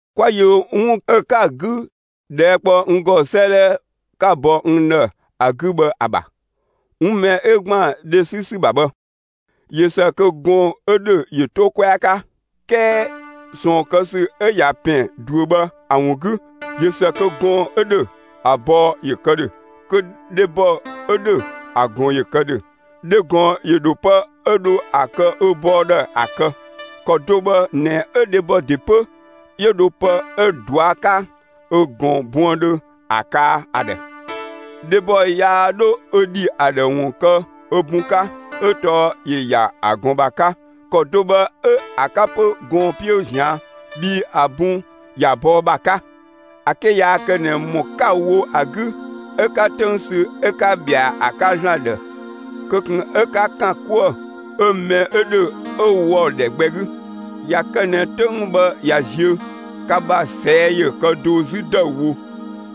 'Kwa yö 'wun 'ö ka‑ 'gü ꞊dhɛɛ' kpɔ n ‑gɔ 'sëëdhɛ 'ka‑ bɔ n ‑dhë ‑a 'gü bhë ‑a ‑bha; 'wun mɛ 'ö ‑gban dhe 'sü ‑sü ‑bha bhë, ꞊yö ‑së kö gɔɔn‑ 'ö ‑dhö ‑yö 'to 'kwɛa 'ka. 'Kɛɛ ꞊sɔɔn kë ‑sü 'ö ꞊ya ‑pɛn ꞊duö bhë ‑a ‑wun 'gü, ꞊yö ‑së kö gɔɔn‑ 'ö ‑dhö, ‑a bɔɔ ‑yö kë ‑dhö, kö dhebɔ 'ö ‑dhö, ‑a ꞊gɔn ‑yö kë ‑dhö. Dhe ꞊gɔn ‑yö ‑dho pë 'ö dho ‑a kë ö bɔɔ ‑dhë ‑a kë; ‑kɔ do bhë ꞊nɛ 'ö dhebɔ ‑de 'pö 'yö dho pë 'ö‑ ꞊dua' 'ka ö ꞊gɔn buëndhö ‑a kaa ‑a ‑dhë. Dhebɔ yaa 'dho ö ‑dhi ‑a ‑dhë ‑wun kë ö bun 'ka, 'ö tɔɔ ‑yö ‑ya ‑a ꞊gɔn ‑bha 'ka; ‑kɔ do bhë 'ö‑ 'ka 'pö gɔɔn‑ 'piö ꞊zian' bhii ‑a bun ‑ya bɔɔ ‑bha 'ka. ‑A 'ke yaa kë ꞊nɛ ‑mɔ 'ka‑ wo ‑a 'gü 'ö 'ka 'töng sü 'ö 'ka ꞊bhɛa ‑a 'ka ‑Zlan ‑dhë, kö ꞊kun 'ö 'ka ‑kan 'kuë‑ 'ö mɛ 'ö ‑dhö 'ö ‑wɔ ‑dhɛ gbɛ 'gü. ꞊Ya kë ꞊nɛ 'töng bhë ꞊ya ziö, ka ‑bha ꞊sɛɛ' ‑yö kë do 'zü ‑dëüwo;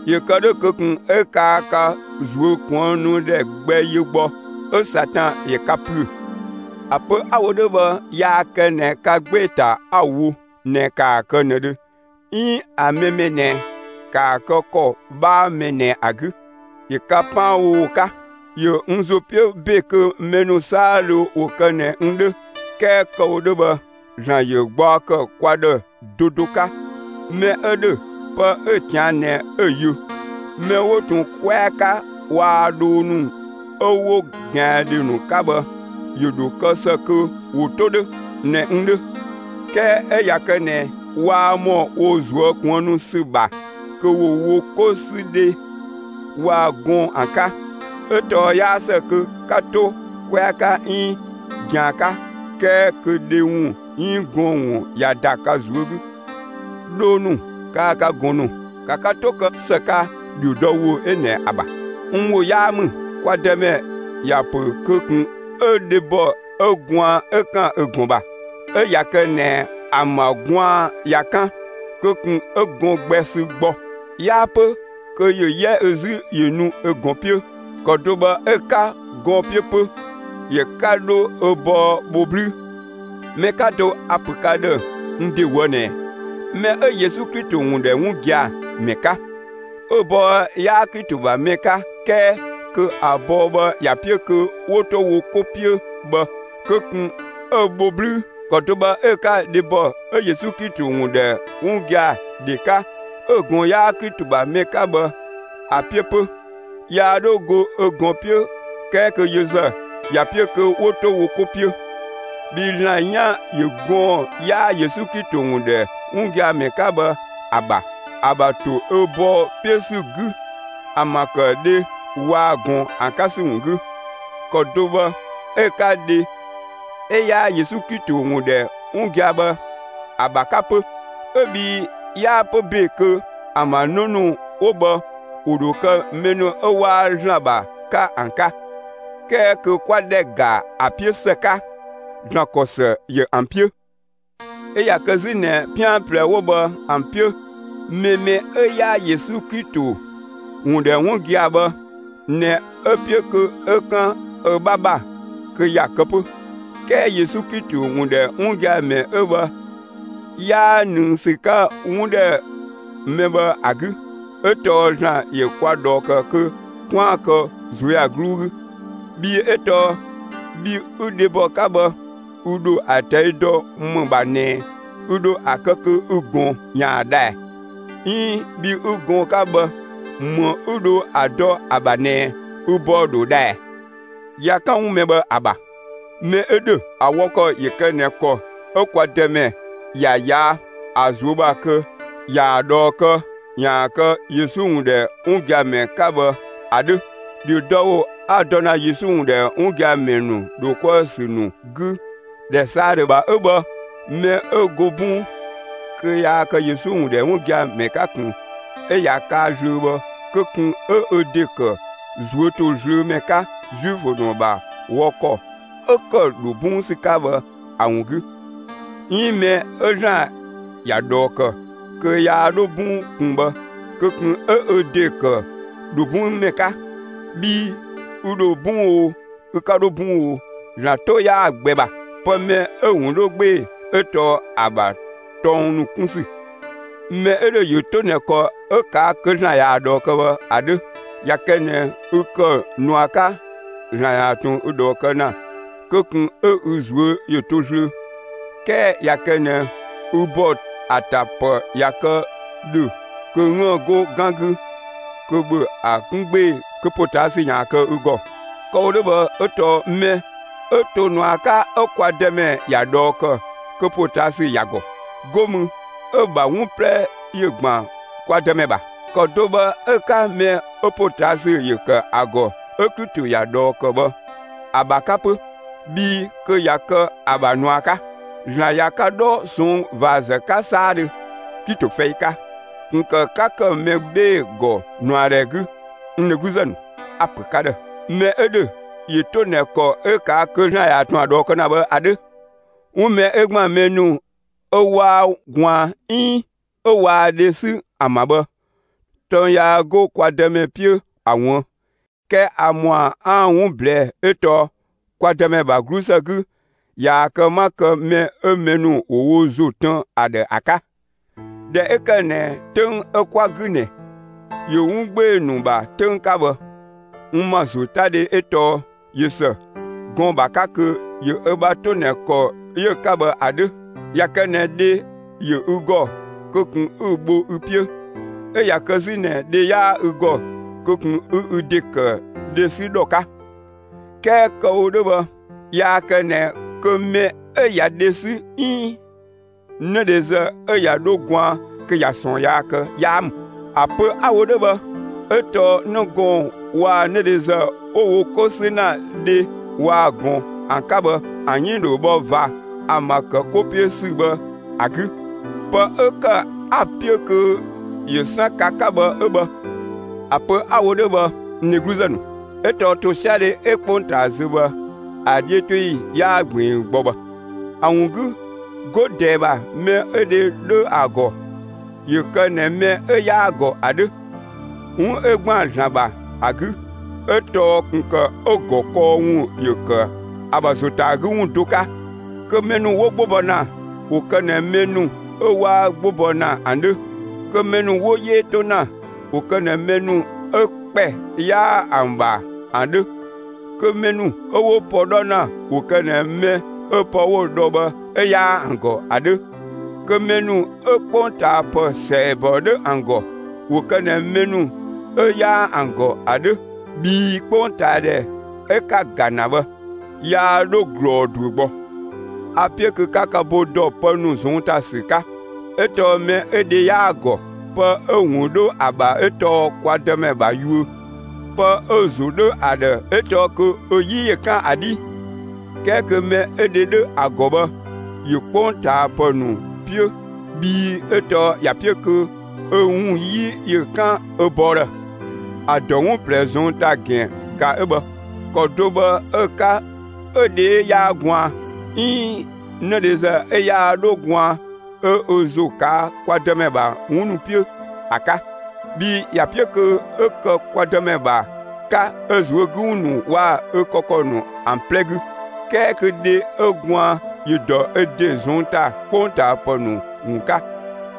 ‑yö kë 'dhö kö ꞊kun 'ö kaa ka ꞊zuökuënnudhɛ gbɛ yö gbɔ, 'ö Satan ‑yö ka ‑püö. ‑A pö 'a‑ wo 'dhö bhë, yaa kë ꞊nɛ ka 'gbee‑ ‑ta 'a‑ wo ꞊nɛ ‑kaa kë ꞊nëdhö 'iin ‑a mɛ mɛ ꞊nɛ ‑kaa kë ‑kɔ 'bhaa mɛ ꞊nɛ ‑a 'gü. ‑Yö ka 'paanbhowo 'ka. ‑Yö n ‑zo 'piö ‑be kö mɛ ‑nu 'saadhö ‑wo kë ꞊nɛ n 'dhö; 'kɛɛ kë‑ wo 'dhö bhë, ‑Zlan ‑yö gbaɔ ‑kë kwa ‑dhë do do 'ka. Mɛ 'ö ‑dhö pë 'ö‑ ꞊tian' ꞊nɛ 'ö‑ yö. Mɛ 'wo ꞊tun 'kwɛa 'ka waa‑ dhoo ‑nu 'ö 'wo ꞊gɛandhoo ‑nu 'ka bhë, ‑yö ‑dho kë ‑së kö ‑wo 'to 'dhö ꞊nɛ n 'dhö. 'Kɛɛ 'ö ꞊ya kë ꞊nɛ waa ‑mɔ wo ꞊zuö' kuënnu ‑sü ‑bha, kö ‑wo wo 'kosüdhe waa‑ ꞊gɔɔn ‑an 'ka; 'ö tɔɔ 'yaa ‑së kö 'ka 'to 'kwɛa 'ka 'iin ꞊gɛan 'ka 'kɛɛ kö dhe ‑wun 'iin gɔɔn‑ ꞊ya ‑da ka ꞊zuö' 'gü. Dhoo ‑nu kaa‑ ka ꞊gɔn ‑nu, ‑ka ka 'to kë ‑së 'ka ‑dhiodɔwo 'ö ꞊nɛ ‑a ‑bha; n ‑wo 'yaa ‑mü. Kwa Dëmɛ ‑ya ‑pö kö ꞊kun 'ö dhebɔ 'ö gwaan 'ö ‑kan ö ꞊gɔn ‑bha! 'Ö ꞊ya kë ꞊nɛ ‑an ‑bha gwaan ꞊ya 'kan, kö ꞊kun 'ö ꞊gɔn gbɛ sü gbɔ; 'yaa 'pö kö ‑yö 'yɛ ö 'zü ‑yö nu ö ꞊gɔn 'piö. ‑Kɔ do bhë 'ö‑ 'ka ꞊gɔn 'piö 'pö. Yö 'ka 'dho ö bɔɔ bho 'blü! Mɛ 'ka to, a‑ ‑pö ka ‑dhë n ‑de ꞊woë' ꞊nɛ: Mɛ 'ö Yesu Klito ‑wun ‑dhɛ 'wun gia‑ ‑mɛ 'ka, 'ö‑ bɔɔ 'yaa Klito ‑bha mɛ 'ka 'kɛɛ kö ‑a bɔɔ bhë ‑ya 'piö kö ‑wo 'to wo 'ko 'piö bhë, kö ꞊kun 'ö‑ bho 'blüü! ‑Kɔ do bhë 'ö‑ 'ka dhebɔ 'ö Yesu Klito ‑wun ‑dhɛ 'wun gia‑ ‑dhe 'ka 'ö‑ ꞊gɔn 'yaa‑ Klito ‑bha mɛ 'ka bhë ‑a 'piö 'pö. Yaa 'dho go ö ꞊gɔn 'piö 'kɛɛ kö yö ‑zë ‑ya 'piö kö 'wo 'to wo 'ko 'piö. Bhii ‑Zlan 'yan ‑yö gɔɔn‑ 'yaa Yesu Klito ‑wun ‑dhɛ 'wun gia‑ ‑mɛ 'ka bhë ‑a ‑bha, ‑a ‑bha ‑to ö bɔɔ 'piö ‑sü 'gü ‑an ‑bha ‑kë dhe waa‑ ꞊gɔn ‑an 'ka ‑sü ‑wun 'gü; ‑kɔ do bhë 'ö‑ 'ka dhe 'ö 'yaa Yesu Klito ‑wun ‑dhɛ 'wun gia‑ bhë ‑a ‑bha 'ka 'pö, 'ö bhii 'yaa 'pö ‑be kö ‑an ‑bha 'në ‑nu 'wo bhë ‑wo ‑dho kë mɛ ‑nu 'ö 'waa ‑Zlan ‑bha 'ka ‑an 'ka. 'Kɛɛ kö 'kwa ‑dhɛ ‑ga ‑a 'piö ‑së 'ka, ‑Zlan ‑kɔ ‑së ‑yö ‑an 'piö. 'Ö ꞊ya kë 'zü ꞊nɛ 'pian ꞊plɛ 'wo bhë ‑an 'piö, mɛ mɛ 'ö 'yaa Yesu Klito ‑wun ‑dhɛ 'wun gia‑ bhë ꞊nɛ 'ö‑ 'piö kö 'ö 'kan ö 'bha ‑bha, kö ‑ya kë 'pö; 'kɛɛ Yesu Klito ‑wun ‑dhɛ 'wun gia‑ ‑mɛ 'ö bhë 'yaa ꞊nëng ‑sü 'ka 'wun ‑dhɛ mɛ bhë ‑a 'gü; 'ö tɔɔ ‑Zlan ‑yö kwa ꞊dhɔɔ ‑kë kö 'kwaan‑ kë ꞊zuöyagluu 'gü. Bhii 'ö tɔɔ bhi 'ü dhebɔ 'ka bhë, ü ‑dho ‑a ꞊tɛi' dɔ ‑më ‑bha ꞊nɛ ü ‑dho ‑a kë kö ü ꞊gɔn ‑yaan dha ꞊ɛ, 'iin bhi 'ü gɔɔn‑ 'ka bhë, ‑më 'ü dho ‑a dɔ ‑a ‑bha ꞊nɛ ü bɔɔ ‑dho dha ꞊ɛɛ? ꞊Ya 'kan 'wun mɛ bhë ‑a ‑bha, mɛ 'ö ‑dhö, ‑a wɔ ‑kɔ ‑yö kë ꞊nɛ ‑kɔ 'ö kwa Dëmɛ ‑ya ꞊yaa' ‑a ꞊zuö' ‑bha kö ꞊yaa‑ ꞊dhɔɔ kë ‑yaan kë Yesu ‑wun ‑dhɛ 'wun gia‑ ‑mɛ 'ka bhë ‑a 'dhö. ‑Dhiodɔwo 'a‑ dɔ ‑na Yesu ‑wun ‑dhɛ 'wun gia‑ ‑mɛ ‑nu ‑dho 'kuë‑ ‑sü ‑nu 'gü ‑dhɛ 'saadhö ‑bha 'ö bhë. Mɛ 'ö go 'bɔng kö yaa kë Yesu ‑wun ‑dhɛ 'wun gia‑ ‑mɛ 'ka ꞊kun, 'ö ꞊ya kaa zlöö bhë kö ꞊kun 'ö ö ‑de ‑kë ꞊zuö' ‑to zlöö ‑mɛ 'ka Zuifö ‑nu ‑bha wɔ ‑kɔ 'ö ‑kë ‑dho 'bɔng ‑sü 'ka bhë ‑a ‑wun 'gü. 'Iin mɛ 'ö ‑Zlan ‑ya ꞊dhɔɔ ‑kë kö yaa 'dho 'bɔng ꞊kun bhë, kö ꞊kun 'ö ö ‑de ‑kë ‑dho 'bɔng ‑mɛ 'ka. Bhii ü ‑dho 'bɔng oo, ü 'ka 'dho 'bɔng oo, ‑Zlan 'to 'yaa‑ gbɛ ‑bha. Pë mɛ 'ö‑ ‑wun 'dhö 'gbee‑ 'ö tɔɔ ‑a ‑bha tɔng ‑nu 'kun ‑sü. Mɛ 'ö ‑dhö ‑yö 'to ꞊nɛ ‑kɔ 'ö ꞊kaa' kö ‑Zlan ꞊yaa‑ ꞊dhɔɔ kë bhë ‑a 'dhö. ꞊Ya kë ꞊nɛ ü ‑kë ꞊nua 'ka ‑Zlan ‑yaan ꞊tun ü ꞊dhɔɔ kë ‑na, kö ꞊kun 'ö ü ꞊zuö' ‑yö to zlöö. 'Kɛɛ ꞊ya kë ꞊nɛ ü ‑bɔ ‑a ‑ta ‑pë ꞊ya kë ‑dhö kë 'üën‑ 'go 'gan 'gü, kö ‑bhö ‑a 'kun 'gbee‑ kö ‑potaasü ‑yaan kë ü ‑gɔ! Kë‑ wo 'dhö bhë 'ö tɔɔ mɛ 'ö to ꞊nua 'ka 'ö kwa Dëmɛ ‑ya ꞊dhɔɔ ‑kë kö ‑potaasü ‑ya ‑gɔ, 'go mü 'ö‑ ‑bha 'wun 'plɛ ‑yö ‑gban kwa Dëmɛ ‑bha. ‑Kɔ do bhë 'ö‑ 'ka mɛ 'ö ‑potaasü ‑yö ‑kë ‑a ‑gɔ 'ö Klito ‑ya ꞊dhɔɔ ‑kë bhë ‑a ‑bha 'ka 'pö, bhii kö ꞊ya kë ‑a ‑bha ꞊nua 'ka. ‑Zlan ꞊ya ka 'dhɔ ꞊sɔnng' ꞊vaazë 'ka 'saadhö (Klito fɛi 'ka); ꞊kun ‑kë 'ka ‑kë mɛ 'bhee‑ ‑gɔ ꞊nuadhɛ 'gü! N dhegluzë ‑nu, a‑ ‑pö ka ‑dhë: Mɛ 'ö ‑dhö ‑yö to ꞊nɛ ‑kɔ 'ö ꞊kaa' kö ‑Zlan ‑yaan ꞊tun ‑a ꞊dhɔɔ kë ‑na bhë ‑a 'dhö. 'Wun mɛ 'ö ‑gban mɛ ‑nu 'ö 'waa gwaan 'iin 'ö waa dhe 'sü ‑an ‑bha bhë, tɔng yaa 'go kwa Dëmɛ 'piö ‑a ꞊wuën'; 'kɛɛ a ‑mɔa 'aan‑ ‑wun ꞊blɛɛ' 'ö tɔɔ kwa Dëmɛ ‑bha 'glusë 'gü ꞊yaa‑ kë 'ma kë mɛ 'ö mɛ ‑nu ‑wo wo ‑zo tën n ‑dhë ‑a 'ka. ꞊Dhɛ 'ö ‑kë ꞊nɛ 'töng 'ö 'kwa‑ 'gü ꞊nɛ ‑yö 'wun 'gbee‑ ‑nu ‑bha 'töng 'ka bhë, n ‑ma ‑zotadhe 'ö tɔɔ ꞊yö ‑së gɔɔn‑ ‑bha 'ka kö ‑yö ö bha 'to ꞊nɛ ‑kɔ 'yö‑ 'ka bhë ‑a 'dhö. ꞊Ya kë ꞊nɛ dhe ‑yö ü ‑gɔ, kö ꞊kun 'ü‑ bho ü 'piö; 'ö ꞊ya kë 'zü ꞊nɛ dhe 'yaa ü ‑gɔ, kö ꞊kun 'ü ü ‑de ‑kë dhe 'sü ‑dhɔ 'ka! 'Kɛɛ kë‑ wo 'dhö bhë, yaa kë ꞊nɛ kö mɛ 'ö ꞊ya dhe 'sü 'iin 'nëdhezë 'ö ꞊ya 'dho gwaan kö ꞊ya ꞊sɔɔn yaa kë 'yaa ‑mü. ‑A pö 'a‑ wo 'dhö bhë 'ö tɔɔ 'në gɔɔn‑ waa‑ 'nëdhezë 'wo wo 'ko 'sü ‑na dhe waa‑ ꞊gɔn ‑an 'ka bhë, ‑an 'yënng ‑dho bhɔ ꞊va ‑an ‑bha ‑kë 'ko 'piö ‑sü bhë ‑a 'gü. Pë 'ö ‑kë 'a‑ 'piö kö ‑yö 'san ka 'ka bhë 'ö bhë. ‑A pö 'a‑ wo 'dhö bhë, n dhegluzë ‑nu, 'ö tɔɔ ‑tosiadhe 'ö 'kpongtaa zö bhë, ‑a 'dhiötoyi 'yaa ꞊gbiin gbɔ bhë. ‑A ‑wun 'gü 'go ꞊dɛɛ ‑bha, mɛ 'ö dhe 'dhö ‑a ‑gɔ, ‑yö kë ꞊nɛ mɛ 'ö 'yaa‑ ‑gɔ ‑a 'dhö, 'wun 'ö ‑gban ‑Zlan ‑bha ‑a 'gü ('ö tɔɔ ꞊kun ‑kë ö ‑gɔ kɔɔ ‑wun ‑yö ‑kë ‑a ‑bha ‑zo ‑ta ‑a 'gü ‑wun do 'ka). Kö mɛ ‑nu 'wo 'gbo bɔ ‑na, ‑wo kë ꞊nɛ mɛ ‑nu 'ö 'waa 'gbo bɔ ‑na ‑an 'dhö; kö mɛ ‑nu 'wo 'yee 'to ‑na, ‑wo kë ꞊nɛ mɛ ‑nu 'ö ‑kpɛ 'yaa ‑an ‑bha ‑an 'dhö; kö mɛ ‑nu 'ö 'wo pë 'dhɔ ‑na ‑wo kë ꞊nɛ mɛ 'ö pë 'wo‑ dhɔ bhë 'ö 'yaa ‑an ‑gɔ ‑an 'dhö; kö mɛ ‑nu 'ö 'kpongtaapë ‑sɛɛbɔ 'dhö ‑an ‑gɔ, ‑wo kë ꞊nɛ mɛ ‑nu 'ö 'yaa ‑an ‑gɔ ‑an 'dhö; bhii 'kpongtaadhɛ 'ö 'ka‑ ‑ga ‑na bhë, yaa 'dhö ꞊glɔɔ ꞊duö gbɔ. A‑ 'piö kö 'ka ka bo ‑dɔ pë ‑nu ꞊zɔnng' ‑ta ‑sü 'ka. 'Ö tɔɔ mɛ 'ö dhe 'yaa‑ ‑gɔ, pë 'ö‑ ‑wun 'dho ‑a ‑bha 'ö tɔɔ kwa Dëmɛ ‑bha yuö. Pë 'ö‑ ‑zo 'dhö ‑a ‑dhë 'ö tɔɔ kö ö 'yi ‑yö 'kan ‑a 'dhii. 'Kɛɛ kö mɛ 'ö dhe 'dhö ‑a ‑gɔ bhë ‑yö 'kpongtaapë ‑nu 'piö bhii 'ö tɔɔ ‑ya 'piö kö ö ‑wun 'yi ‑yö 'kan ö bɔɔ ‑dhë. ‑A ‑dɔ 'wun ꞊plɛ ꞊zɔnng' ‑ta ‑gɛn ꞊ga 'ö bhë; ‑kɔ do bhë 'ö‑ 'ka 'ö dhe 'ö 'yaa gwaan 'iin 'nëdhezë 'ö yaa 'dho gwaan 'ö ö ‑zo ꞊kaa' kwa Dëmɛ ‑bha 'wun ‑nu 'piö ‑a 'ka; bhii ‑ya 'piö kö 'ö kë kwa Dëmɛ ‑bha 'ka ö ꞊zuö' 'gü ‑wun ‑nu waa‑ ö kë ‑kɔ ‑nu ‑an 'plɛ 'gü. 'Kɛɛ kö dhe 'ö gwaan ‑yö dɔ ö ‑de ꞊zɔnng' ‑ta 'kpongtaapë ‑nu ‑wun 'ka;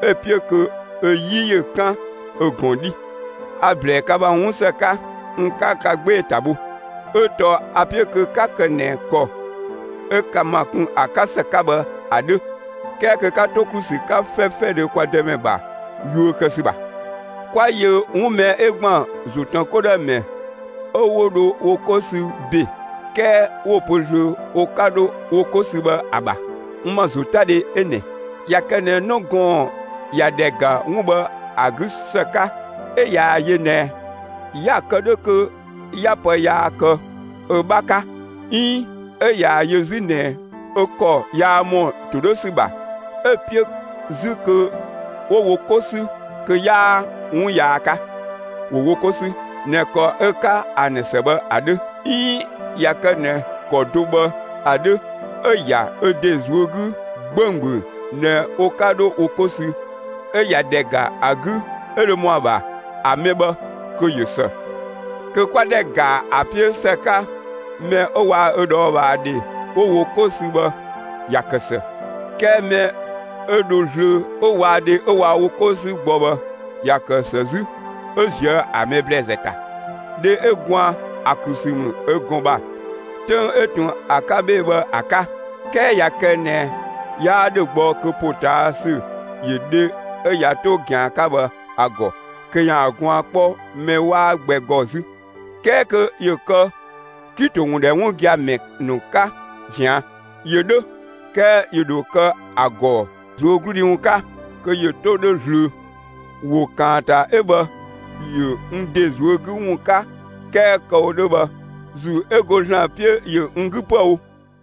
'ö‑ 'piö kö ö 'yi ‑yö 'kan ö ꞊gɔn 'dhi. A‑ ‑blɛɛ ka ‑bha 'wunsë 'ka; n 'ka ka 'gbee‑ ‑ta bho; 'ö tɔɔ a‑ 'piö kö 'ka kë ꞊nɛ ‑kɔ 'ö ka ‑ma kun ‑a 'ka ‑së 'ka bhë ‑a 'dhö, 'kɛɛ kö 'ka 'to ‑klu ‑sü 'ka 'fɛfɛdhö kwa Dëmɛ ‑bha yuö kë ‑sü ‑bha. 'Kwa yö 'wun mɛ 'ö ‑gban ‑zo ‑tën 'ko ‑dhë ‑mɛ 'ö 'wo dho wo 'ko sü ‑be 'kɛɛ 'wo‑ pö zlöö wo 'ka 'dho wo 'ko sü bhë ‑a ‑bha; n ‑ma ‑zotadhe 'ö ꞊nɛ: ꞊Ya kë ꞊nɛ 'në gɔɔn‑ ꞊ya ‑dhɛ ‑ga 'wun bhë ‑a 'gü ‑së 'ka 'ö ꞊yaa‑ yö ꞊nɛ 'ya‑ kë 'dhö kö 'ya pë yaa kë ö 'bha 'ka 'iin 'ö ꞊yaa‑ yö 'zü ꞊nɛ ö ‑kɔ yaa ‑mɔ ‑to 'dhö ‑sü ‑bha, 'ö‑ 'piö 'zü kö 'wo wo 'ko 'sü, kö 'yaa 'wun yaa 'ka; ‑wo wo 'ko 'sü ꞊nɛ ‑kɔ 'ö‑ 'ka ‑an ‑dhë ‑së bhë ‑a 'dhö. 'Iin ꞊ya kë ꞊nɛ ‑kɔ do bhë ‑a 'dhö 'ö‑ ‑ya ö ‑de ꞊zuö' 'gü 'gbönggböng ꞊nɛ wo 'ka 'dho wo 'ko sü, 'ö ꞊ya ‑dhɛ ‑ga ‑a 'gü 'ö dho ‑mɔ ‑a ‑bha, ‑a mɛ bhë kö ꞊yö ‑së. Kö 'kwa ‑dhɛ ‑ga ‑a 'piö ‑së 'ka mɛ 'ö waa‑ ö ꞊dhɔɔbhaadhe 'wo wo 'ko sü bhë, ‑ya ‑kë ‑së. 'Kɛɛ mɛ 'ö dho zlöö 'ö waa‑ dhe 'ö waa wo 'ko 'sü gbɔ bhë, ‑ya ‑kë ‑së 'zü ('ö ꞊zië' ‑a mɛ ‑blɛɛzë ‑ta). Dhe 'ö gwaan, ‑a ‑klu ‑sü ‑mü ö ꞊gɔn ‑bha 'töng 'ö ꞊tun ‑a 'ka 'bhee‑ 'gü bhë ‑a 'ka; 'kɛɛ ꞊ya kë ꞊nɛ 'yaa ‑dhö gbɔ kö ‑potaasü ‑yö dhe 'ö ꞊ya 'to ꞊gɛan 'ka bhë ‑a ‑gɔ kö ‑yaan gwaan 'kpɔ mɛ 'waa gbɛ ‑gɔ 'zü; 'kɛɛ kö ‑yö kë Klito ‑wun ‑dhɛ 'wun gia‑ ‑mɛ ‑nu 'ka ꞊zian'. ‑Yö 'dhö 'kɛɛ ‑yö ‑dho kë ‑a ‑gɔ ꞊zuögludhi ‑wun 'ka kö ‑yö 'to 'dhö zlöö. ‑Wo ‑kaanta 'ö bhë, ‑yö n ‑de ꞊zuö' 'gü ‑wun 'ka 'kɛɛ kë‑ wo 'dhö bhë, ‑Zuu 'ö go ‑Zlan 'piö ‑yö n 'gü 'püë‑ wo!